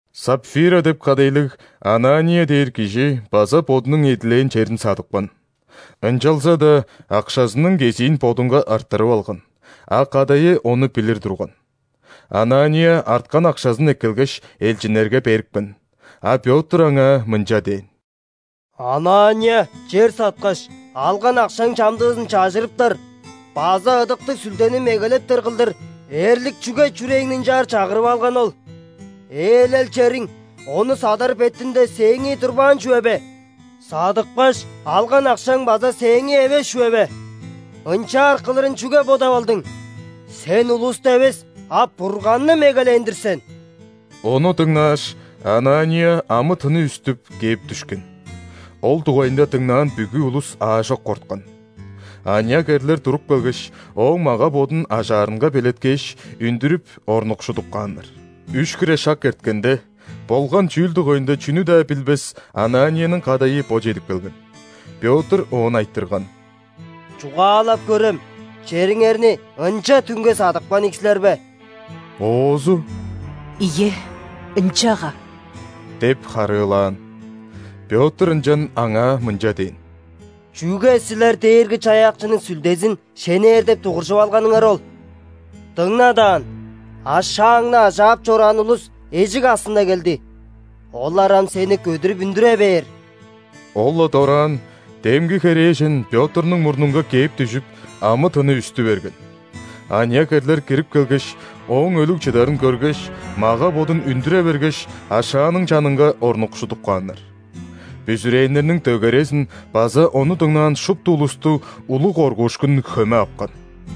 Сапфира деп кадайлыг Анания дээр кижи база бодунуң эдилээн черин садыпкан. Ынчалза-даа акшазының кезиин бодунга арттырып алган, а кадайы ону билир турган. Анания арткан акшазын эккелгеш, элчиннерге берипкен. А Пётр аңаа мынча дээн: «Анания, чер саткаш, алган акшаң чамдыызын чажырыптар база Ыдыктыг Сүлдени мегелептер кылдыр эрлик чүге чүрээңни ынчаар чагырып алганы ол? Ээлел чериң, ону садар бетинде, сээңии турбаан чүве бе? Садыпкаш, алган акшаң база сээңии эвес чүве бе? Ынчаар кылырын чүге бодап алдың? Сен улусту эвес, а Бурганны мегелээн-дир сен». Ону дыңнааш, Анания, амы-тыны үстүп, кээп дүшкен. Ол дугайында дыңнаан бүгү улус аажок корткан. Аныяк эрлер туруп келгеш, ооң мага-бодун ажаарынга белеткээш, үндүрүп, орнукшудуп кааннар. Үш хире шак эрткенде, болган чүүл дугайында чүнү-даа билбес Ананияның кадайы бо чедип келген. Пётр оон айтырган: «Чугаалап көрем, чериңерни ынча түңге садыпкан ийик силер бе?» Оозу: «Ийе, ынчага» – деп харыылаан. Пётр ынчан аңаа мынча дээн: «Чүге силер Дээрги-Чаяакчының Сүлдезин шенээр деп дугуржуп алганыңар ол? Дыңна даан, ашааңны ажаап чораан улус эжик аксында келди, олар ам сени көдүрүп үндүре бээр». Ол-ла дораан демги херээжен Пётрнуң мурнунга кээп дүжүп, амы-тыны үстү берген. Аныяк эрлер кирип келгеш, ооң өлүг чыдарын көргеш, мага-бодун үндүре бергеш, ашааның чанынга орнукшудуп кааннар. Бүзүрээннерниң дөгерезин база ону дыңнаан шупту улусту улуг коргуушкун хөме апкан.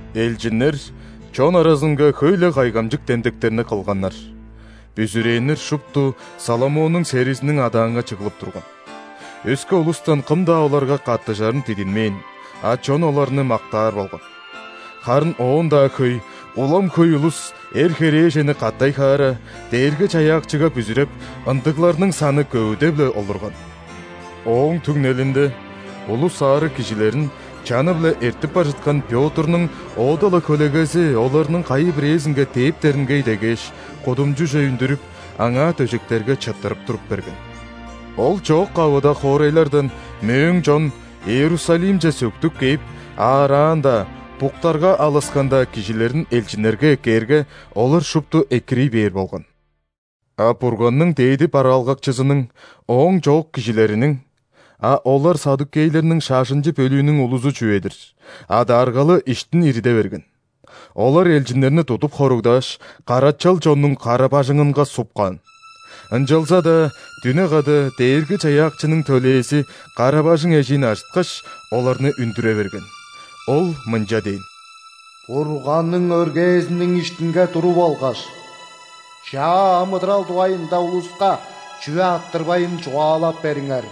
Элчиннер чон аразынга хөй-ле кайгамчык демдектерни кылганнар. Бүзүрээннер шупту Соломоннуң серизиниң адаанга чыглып турган. Өске улустан кым-даа оларга каттыжарын дидинмээн, а чон оларны мактаар болган. Харын оон-даа хөй, улам хөй улус, эр-херээжени катай-хаара, Дээрги-Чаяакчыга бүзүреп, ындыгларның саны көвүдеп-ле олурган. Ооң түңнелинде улус аарыг кижилерин, чаны-биле эртип бар чыткан Пётрнуң оода-ла хөлегези оларның кайы-бирээзинге дээптеринге идегээш, кудумчуже үндүрүп, аңаа дөжектерге чыттырып туруп берген. Ол чоок-кавыда хоорайлардан мөөң чон Иерусалимче сөктүп кээп, аараан-даа, буктарга алыскан-даа кижилерин элчиннерге эккээрге, олар шупту экирий бээр болган. А Бурганның дээди бараалгакчызының, ооң чоок кижилериниң (а олар ·саддукейлерниң шажынчы бөлүүнүң улузу чүве-дир) адааргалы иштин ириде берген. Олар элчиннерни тудуп хоругдааш, карачал чоннуң кара-бажыңынга суп каан. Ынчалза-даа дүне када Дээрги-Чаяакчының төлээзи кара-бажың эжиин ажыткаш, оларны үндүре берген. Ол мынча дээн: «Бурганның өргээзиниң иштинге туруп алгаш, чаа амыдырал дугайында улуска, чүве арттырбайн, чугаалап бериңер!»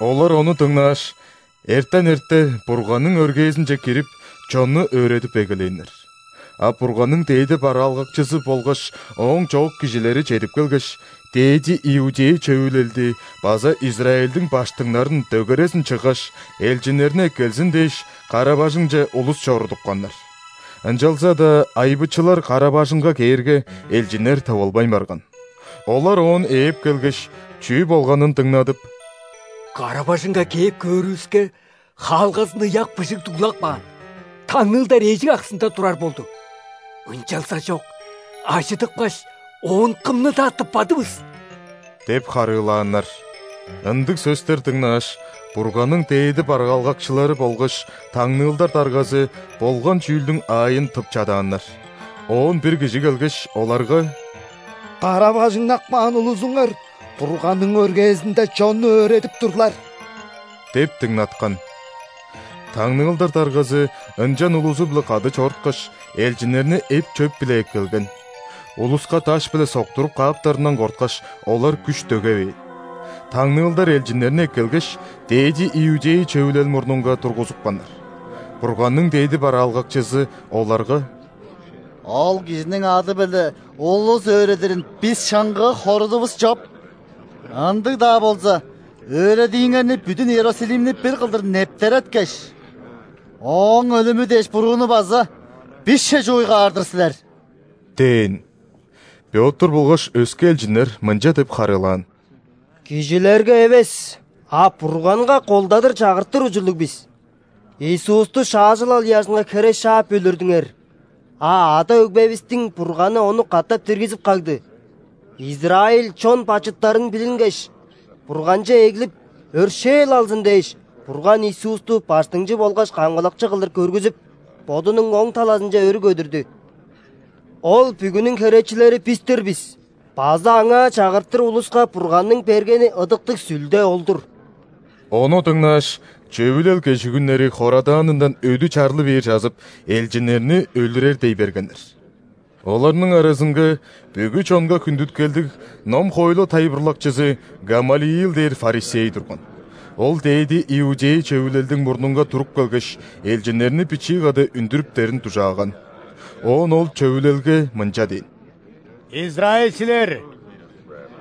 Олар ону дыңнааш, эртен эрте Бурганның өргээзинче кирип, чонну өөредип эгелээннер. А Бурганның дээди бараалгакчызы болгаш ооң чоок кижилери чедип келгеш, ·дээди иудей Чөвүлелди база Израильдиң ·баштыңнарын дөгерезин чыггаш, элчиннерни эккелзин дээш, кара-бажыңче улус чорудупканнар. Ынчалза-даа айбычылар кара-бажыңга кээрге, элчиннер тывылбайн барган. Олар оон ээп келгеш, чүү болганын дыңнадып: «Кара-бажыңга кээп, көөрүвүске, хаалгазын ыяк быжыг дуглап каан, таңныылдар эжик аксында турар болду. Ынчалзажок ажыдыпкаш, оон кымны-даа тыппадывыс» – деп харыылааннар. Ындыг сөстер дыңнааш, Бурганның дээди бараалгакчылары болгаш таңныылдар даргазы болган чүүлдүң аайын тып чадааннар. Оон бир кижи келгеш, оларга: «Кара-бажыңнап каан улузуңар Бурганның өргээзинде чонну өөредип турлар!» – деп дыңнаткан. Таңныылдар даргазы ынчан улузу-биле кады чоруткаш, элчиннерни эп-чөп-биле эккелген. Улуска даш-биле соктуруп кааптарындан корткаш, олар күш дөгевээн. Таңныылдар элчиннерни эккелгеш, ·дээди иудей Чөвүлел мурнунга тургузупканнар. Бурганның дээди бараалгакчызы оларга: «Ол кижиниң ады-биле улус өөредирин бис шыңгыы хорудувус чоп. Ындыг-даа болза, өөредииңерни бүдүн Иерусалимни бир кылдыр нептереткеш, Ооң өлүмү дээш бурууну база бисче чууй каар-дыр силер» – дээн. Пётр болгаш өске элчиннер мынча деп харыылаан: «Кижилерге эвес, а Бурганга колдадыр чагыртыр ужурлуг бис. Иисусту шаажылал ыяжынга хере шаап өлүрдүңер, а ада-өгбевистиң Бурганы Ону катап диргизип кагды. Израиль чон бачыттарын билингеш, Бурганче эглип, өршээл алзын дээш, Бурган Иисусту Баштыңчы болгаш Камгалакчы кылдыр көргүзүп, Бодунуң оң талазынче өрү көдүрдү. Ол бүгүнүң херечилери – бис-тир бис база Аңаа чагыртыр улуска Бурганның бергени Ыдыктыг Сүлде ол-дур». Ону дыңнааш, Чөвүлел кежигүннери хорадаанындан өдү чарлы бер чазып, элчиннерни өлүрер дей бергеннер. Оларның аразынга бүгү чонга хүндүткелдиг ном-хоойлу тайылбырлакчызы Гамалиил дээр ·фарисей турган. Ол ·дээди иудей Чөвүлелдиң мурнунга туруп келгеш, элчиннерни бичии када үндүрүптерин дужааган. Оон ол Чөвүлелге мынча дээн: «Израильчилер!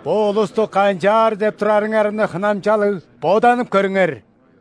Бо улусту канчаар деп турарыңарны хынамчалыг боданып көрүңер.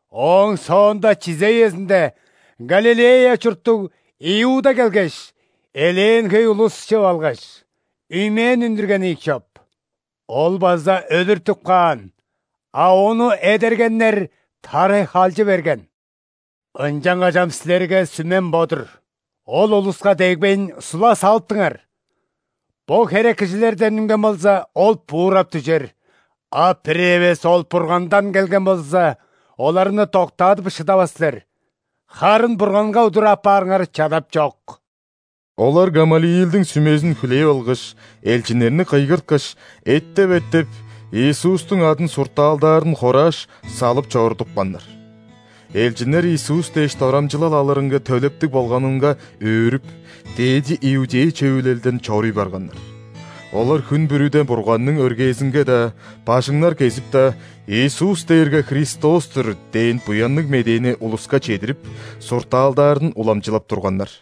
Ооң соонда чизе үезинде Галилея чурттуг Иуда келгеш, элээн хөй улус чыып алгаш, үймээн үндүрген ийик чоп. Ол база өлүртүп каан, а ону эдергеннер тарай халчы берген. Ынчангаш ам силерге сүмем бо-дур: ол улуска дегбейн, сула салыптыңар. Бо херек кижилерден үнген болза, ол буурап дүжер. А бир эвес ол Бургандан келген болза, оларны доктаадып шыдавас силер, харын Бурганга удур апаарыңар чадапчок». Олар Гамалиилдиң сүмезин хүлээп алгаш, элчиннерни кыйгырткаш, эттеп-эттеп, Иисустуң адын суртаалдаарын хорааш, салып чорудупканнар. Элчиннер Иисус дээш дорамчылал алырынга төлептиг болганынга өөрүп, ·дээди иудей Чөвүлелден чоруй барганнар. Олар хүн бүрүде Бурганның өргээзинге-даа, бажыңнар кезип-даа, «Иисус дээрге Христос-тур» дээн Буянныг Медээни улуска чедирип, суртаалдаарын уламчылап турганнар.